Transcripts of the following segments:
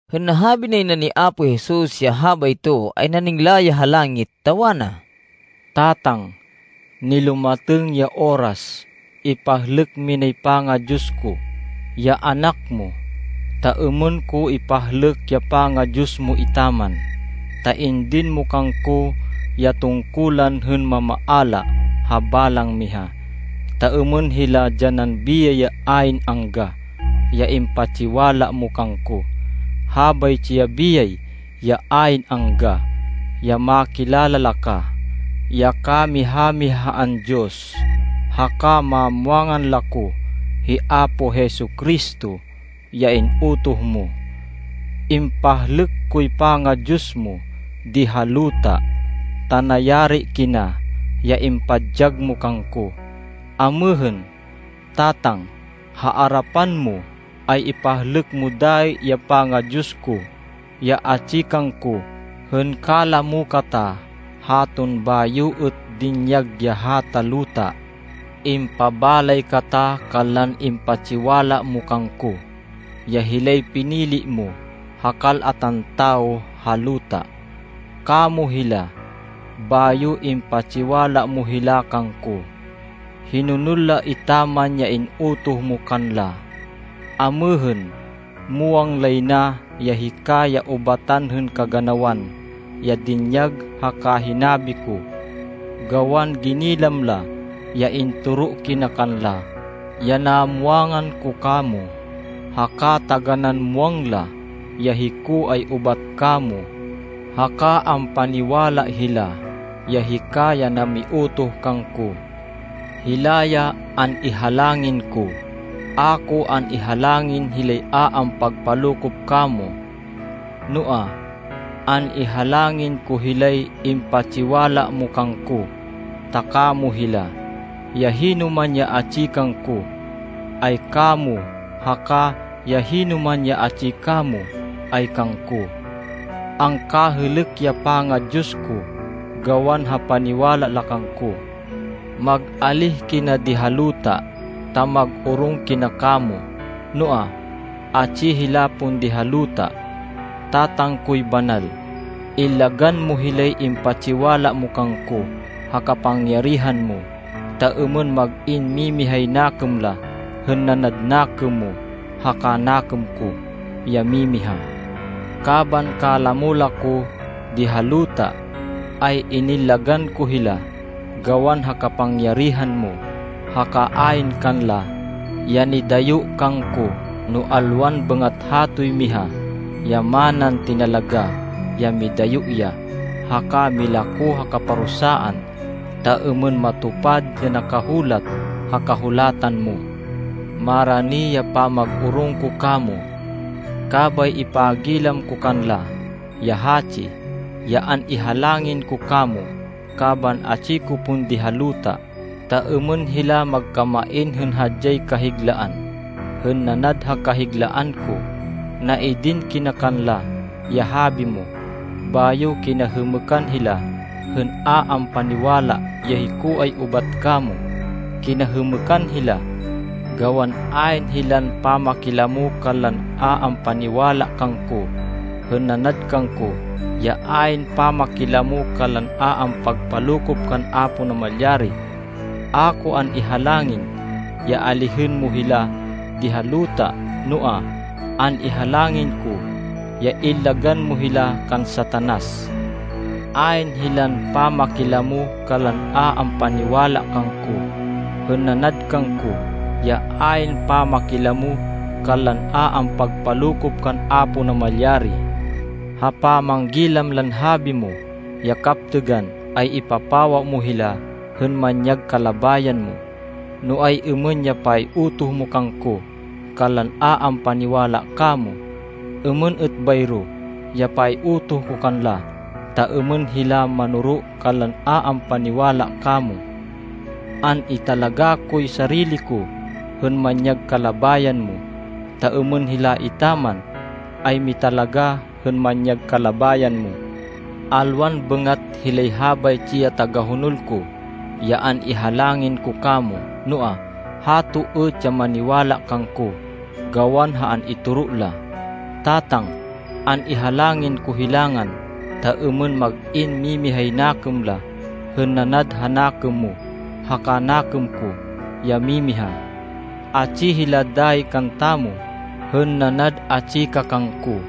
Hên nahabi nay na ni Apo Jesus, ya habayto, ay naningla ya ha langit ta wana, “Tatang, nilumatêng ya oras. Ipahlêk minay panga-Diyos ko, ya Anak mo, ta êmên ko ipahlêk ya panga-Diyos mo etaman. Ta indin mo kangko ya tungkulan hên mamaala ha balang miha, ta êmên hila dyanan biyay ya ayn angga ya impatsiwala mo kangko. Habaytsi ya biyay ya ayn angga, ya makilala la ka, ya kamiha-mihaan Diyos, haka mamwangan la ko, hi Apo Jesu-Cristo ya in-utoh mo. Impahlêk koy panga-Diyos mo di ha luta ta nayari kina ya impadyag mo kangko. Amêhên, Tatang, ha arapan mo, ay ipahlêk mo dayi ya panga-Diyos ko, ya atsi kangko hên kalamo kata haton bayo êt dinyag ya hata luta. “Impabalay kata kanlan impatsiwala mo kangko, ya hilay pinili mo ha kal-atan tawo ha luta. Kamo hila, bayo impatsiwala mo hila kangko. Hinonol la etaman ya in-utoh mo kanla. Amêhên muwang lay na ya hika ya ubatan hên kaganawan ya dinyag haka hinabi ko. Gawan ginilam la ya intoro kina kanla, ya namwangan ko kamo, haka taganán muwang la, ya hiko ay ubat kamo, haka ampaniwala hila, ya hika ya namiutoh kangko. “Hila ya an-ihalangin ko. A ko an-ihalangin hilay a ampagpalokop kamo. Noa, an-ihalangin ko hilay impatsiwala mo kangko, ta kamo hila. Ya hinoman ya atsi kangko, ay kamo, haka ya hinoman ya atsi kamo, ay kangko. Angkahêlêk ya panga-Diyos ko gawan ha paniwala la kangko. Mag-alíh kina di ha luta, ta mag-orong kina kamo. Noa, atsi hila pon di ha luta. Tatang koy banal, illagan mo hilay impatsiwala mo kangko ha kapangyarihan mo, ta êmên mag-in mimihay nakêm la, hên nanad nakêm mo haka nakêm ko, ya mimiha. Kaban kalamo la ko, di ha luta, ay inillagan ko hila gawan ha kapangyarihan mo, haka ayn kanla ya nidayo kangko, no alwan bêngat hatoy miha ya manan tinalagá ya midayo ya, haka milako ha kaparusaan, ta êmên matupad ya nakahulat ha Kahulatan mo. Marani ya pamag-orong ko kamo. Kabay ipagilam ko kanla ya hatsi, ya an-ihalangin ko kamo, kaban atsi ko pon di ha luta, ta êmên hila magkamain hên hadyay kahiglaan, hên nanad ha kahiglaan ko. Naidin kina kanla ya habi mo, bayo kinahêmêkan hila hên a ampaniwala, ya hiko ay ubat kamo. Kinahêmêkan hila, gawan ayn hilan pamakilamo kanlan a ampaniwala kangko, hên nanad kangko ya ayn pamakilamo kanlan a ampagpalokop kan Apo Namalyari. A ko an-ihalangin ya alihên mo hila di ha luta, noa, an-ihalangin ko ya illagan mo hila kan Satanas. Ayn hilan pamakilamo kanlan a ampaniwala kangko, hên nanad kangko ya ayn pamakilamo kanlan a ampagpalokop kan Apo Namalyari. Ha pamanggilam lan habi mo ya kaptêgan ay ipapawa mo hila hên manyag kalabayan mo. No ay-êmên ya pay-utoh mo kangko kanlan a ampaniwala kamo, êmên êt bayro ya pay-utoh ko kanla, ta êmên hila manoro kanlan a ampaniwala kamo. An-italagá koy sarili ko hên manyag kalabayan mo, ta êmên hila etaman ay mitalagá hên manyag kalabayan mo. “Alwan bêngat hilay habaytsi ya tagahonol ko ya an-ihalangin ko kamo, noa, hato êt ya maniwala kangko gawan ha an-itoro la. Tatang, an-ihalangin ko hilangan ta êmên mag-in mimihay nakêm la, hên nanad ha nakêm mo haka nakêm ko ya mimiha. Atsi hila dayi kantamo hên nanad atsi ka kangko,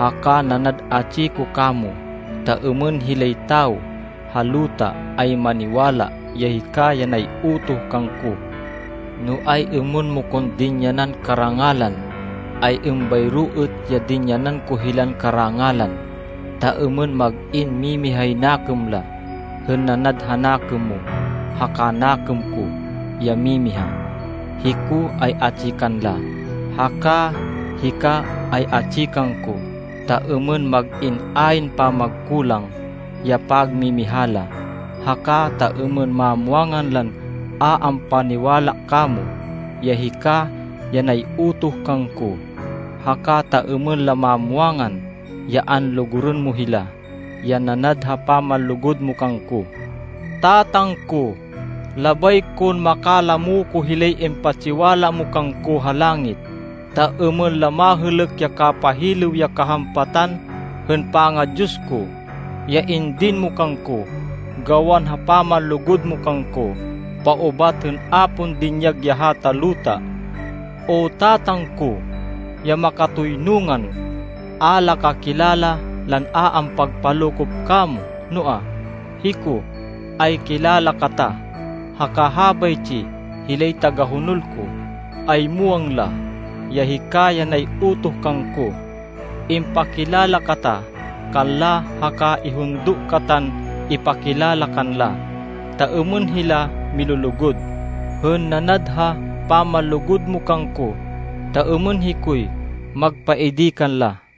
haka nanad atsi ko kamo, ta êmên hilay tawo ha luta ay maniwala ya hika ya nay-utoh kangko. No ay-êmên mo kon dinyanan karangalan, ay êmbayro êt ya dinyanan ko hilan karangalan, ta êmên mag-in mimihay nakêm la, hên nanad ha nakêm mo haka nakêm ko ya mimiha. Hiko ay atsi kanla, haka hika ay atsi kangko, ta êmên mag-in ayn pamagkulang ya pagmimiha la. Haka, ta êmên mamwangan lan a ampaniwala kamo, ya hika ya nay-utoh kangko. Haka, ta êmên la mamwangan ya anlugurên mo hila, ya nanad ha pamanlugud mo kangko. “Tatang ko, labay kon makalamo ko hilay impatsiwala mo kangko ha langit, ta êmên la mahêlêk ya kapahilêw ya kahampatan hên panga-Diyos ko, ya indin mo kangko gawan ha pamanlugud mo kangko paubat hên a pon dinyag ya hata luta. O Tatang ko, ya makatoynungan, a la ka kilala lan a ampagpalokop kamo. Noa, hiko, ay kilala kata, haka habaytsi hilay tagahonol ko, ay muwang la, ya hika ya nay-utoh kangko. Impakilala kata kanla haka ihundo katan ipakilala kanla, ta êmên hila milulugud, hên nanad ha pamanlugud mo kangko ta êmên hikoy magpaidi kanla.”